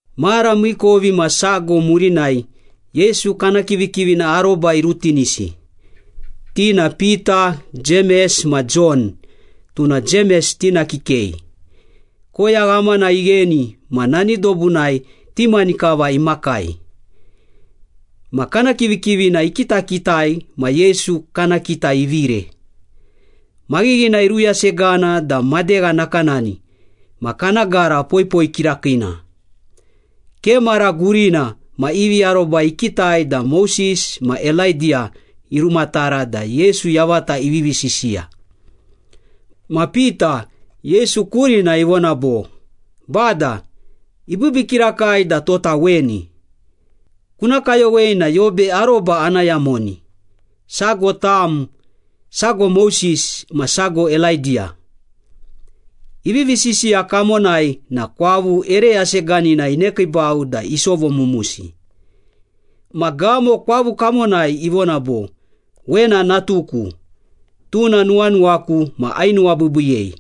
Mara miikovimasago murinai Yesu kana kivikivina aroba irutinisi, ti na Pita, Jemes ma Jon, tuna Jemes tina kikei. Koya ghamana igheni ma nani dobunai ti mani kava imakai. Ma kana kivikivina ikitakitai ma Yesu kana kita ivire. Maghighina iruyasegana da madegha nakanani ma kana gara poipoi kirakiina. Ke mara gurina ma ivi aroba ikitai da Moses ma Elaidiya irumatara da Yesu yavata ivivi sisiya. Ma Pita, Yesu kurina ivona bo, “Bada, ibiibii kirakai da tota weni! Kuna kayowei na yobe aroba ana yamoni. Sago tam, sago Moses, ma sago Elaidiya.” Ivivi sisiya kamonai na kwavu ere yaseganina inekiibau da isovomumusi. Ma gamo kwavu kamonai ivona bo, “Wena natuku, tuna nuwanuwaku ma ainuwabiibiiyei.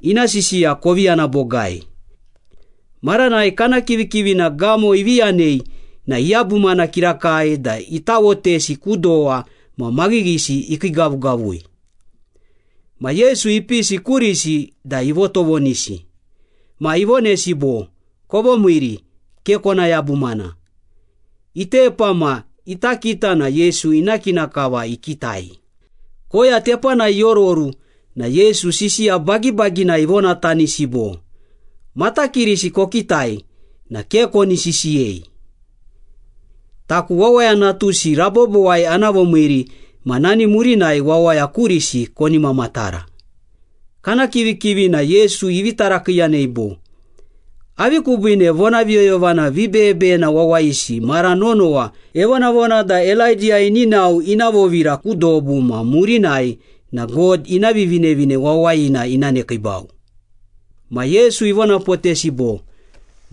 Ina sisiya kovi yana bogai.” Maranai kana kivikivina gamo ivi yanei na iyabumana kirakai da itawotesi ku dowa ma maghighisi ikiigavugavui. Ma Yesu ipisi kurisi da ivotovonisi. Ma ivonesi bo, “Kovomiiri, ke kona yabumana.” Itepa ma ita kita na Yesu ina kina kava ikitai. Koya tepanai iororu na Yesu sisiya bagibaginai ivonatanisi bo, “Matakirisi kokitai na ke koni sisiyei. Taku Wawaya Natusi rabobowai ana vomiiri ma nani murinai wawaya kurisi koni mamatara.” Kana kivikivina Yesu ivi tarakiiyanei bo, “Avi kubiine vonaviyoyovana vibeyebeyena wawayisi mara nonowa evonavona da Elaidiya ini nao ina vovira ku dobu ma murinai na God ina Vivinevine Wawayina ina nekiibau?” Ma Yesu ivonapotesi bo,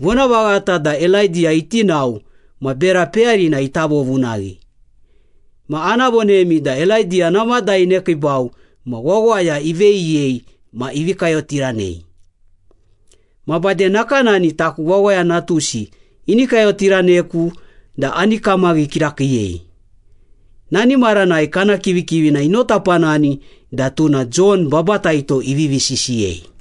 “Vonavaghata da Elaidiya iti nao ma bera peyarina ita vovunaghi. Ma ana vonemi da Elaidiya namada inekiibau ma wawaya iveyiyei ma ivi kayotiranei. Ma bade nakanani taku Wawaya Natusi ini kayotiraneku da ani kamaghi kirakiiyei.” Nani maranai kana kivikivina inotapanani da tuna Jon Babataito ivivi sisiyei.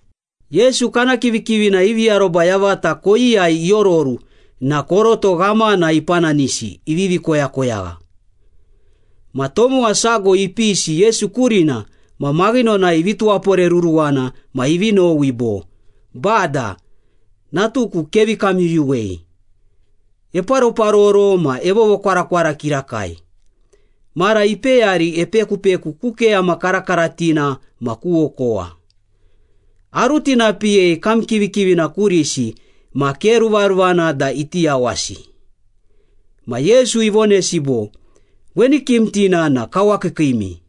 Yesu kana kivikivina ivi aroba yavata koyiyai iororu na koroto ghamana ipananisi ivivi koyakoyagha. Ma tomowa sago ipisi Yesu kurina ma maghinonai ivi tuwaporeruruwana ma ivi nowi bo, “Bada, natuku kevi kamyuyuwei. Eparoparoro ma evovokwarakwara kirakai. Mara ipeyari epekupeku ku keyama karakaratina ma ku okowa. Arutinapiyei kam kivikivina kurisi ma ke ruvaruvana da iti yawasi.” Ma Yesu ivonesi bo, “Weni kimtina na kawakiikiimi.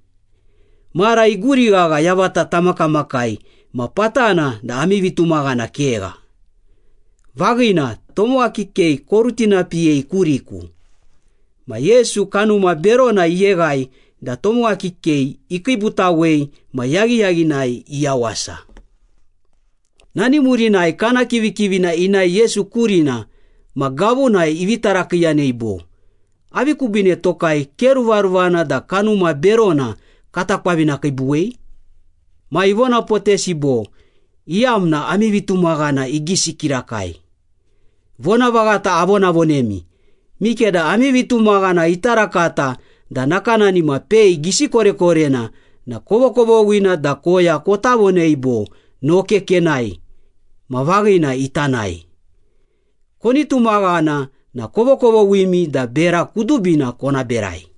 Mara iguri ghagha yavata tamakamakai ma patana da ami vitumaghana kegha! Vaghina, tomowa kikei korutinapiyei kuriku.” Ma Yesu kanuma berona iyeghai da tomowa kikei ikiibutawei ma yaghiyaghinai iyawasa. Nani murinai kana kivikivina inae Yesu kurina ma gavunai ivi tarakiiyanei bo, “Avi kubiine tokai ke ruvaruvana da kanuma berona kata kwavinakiibuwei?” Ma ivonapotesi bo, “Iyamna ami vitumaghana igisi kirakai. Vonavaghata avonavonemi, mikeda ami vitumaghana ita rakata da nakanani ma pei gisi korekorena na kovokovoghina da koya kota vonei bo, ‘Noke kenae’ ma vaghina ita nae. Koni tumaghana na kovokovoghimi da bera kudubina kona berai.”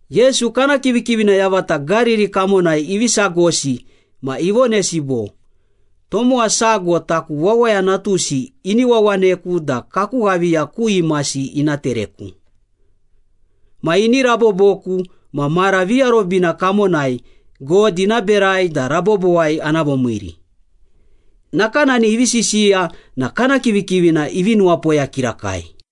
Yesu kana kivikivina yavata Gariri kamonai ivi sagosi ma ivonesi bo, “Tomowa sago taku Wawaya Natusi ini wawaneku da kaku ghaviya ku imasi ina tereku. Ma ini raboboku ma mara viarobina kamonai God ina berai da rabobowai ana vomiiri.” Nakanani ivi sisiya na kana kivikivina ivi nuwapoya kirakai.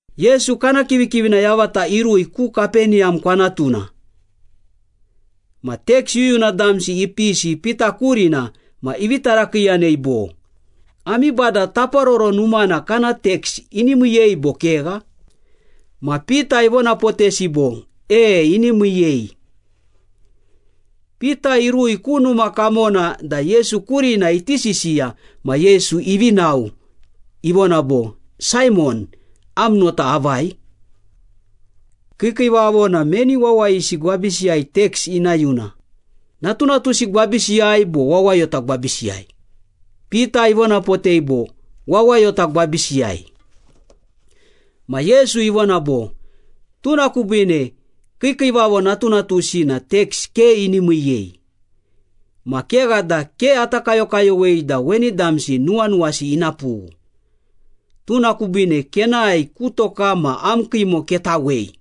Yesu kana kivikivina yavata irui ku Kapeniyam kwanatuna. Ma teks yuyuna damsi ipisi Pita kurina ma ivi tarakiiyanei bo, “Ami Bada Taparoro Numana kana teks ini miiyei bo kegha?” Ma Pita ivonapotesi bo, “E, ini miiyei.” Pita irui ku numa kamona da Yesu kurina iti sisiya ma Yesu ivi nao, ivona bo, “Saimon, am nota avai? Kiikiivavo na meni wawayisi gwabisiyai teks ina yuna, natunatusi gwabisiyai bo wawayota gwabisiyai?” Pita ivonapotei bo, “Wawayota gwabisiyai.” Ma Yesu ivona bo, “Tuna kubiine kiikiivavo natunatusi na teks ke ini miiyei. Ma kegha da ke ata kayokayowei da weni damsi nuwanuwasi ina pughu. Tuna kubiine kenae ku toka ma am kiimo ketawei.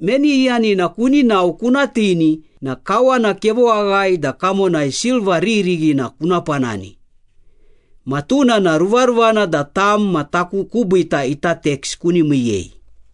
Meni iyanina kuni nao kuna tini na kawana kevoaghae da kamonai silva riririghina kuna panani. Ma tuna na ruvaruvana da tam ma taku kubiita ita teks kuni miiyei.”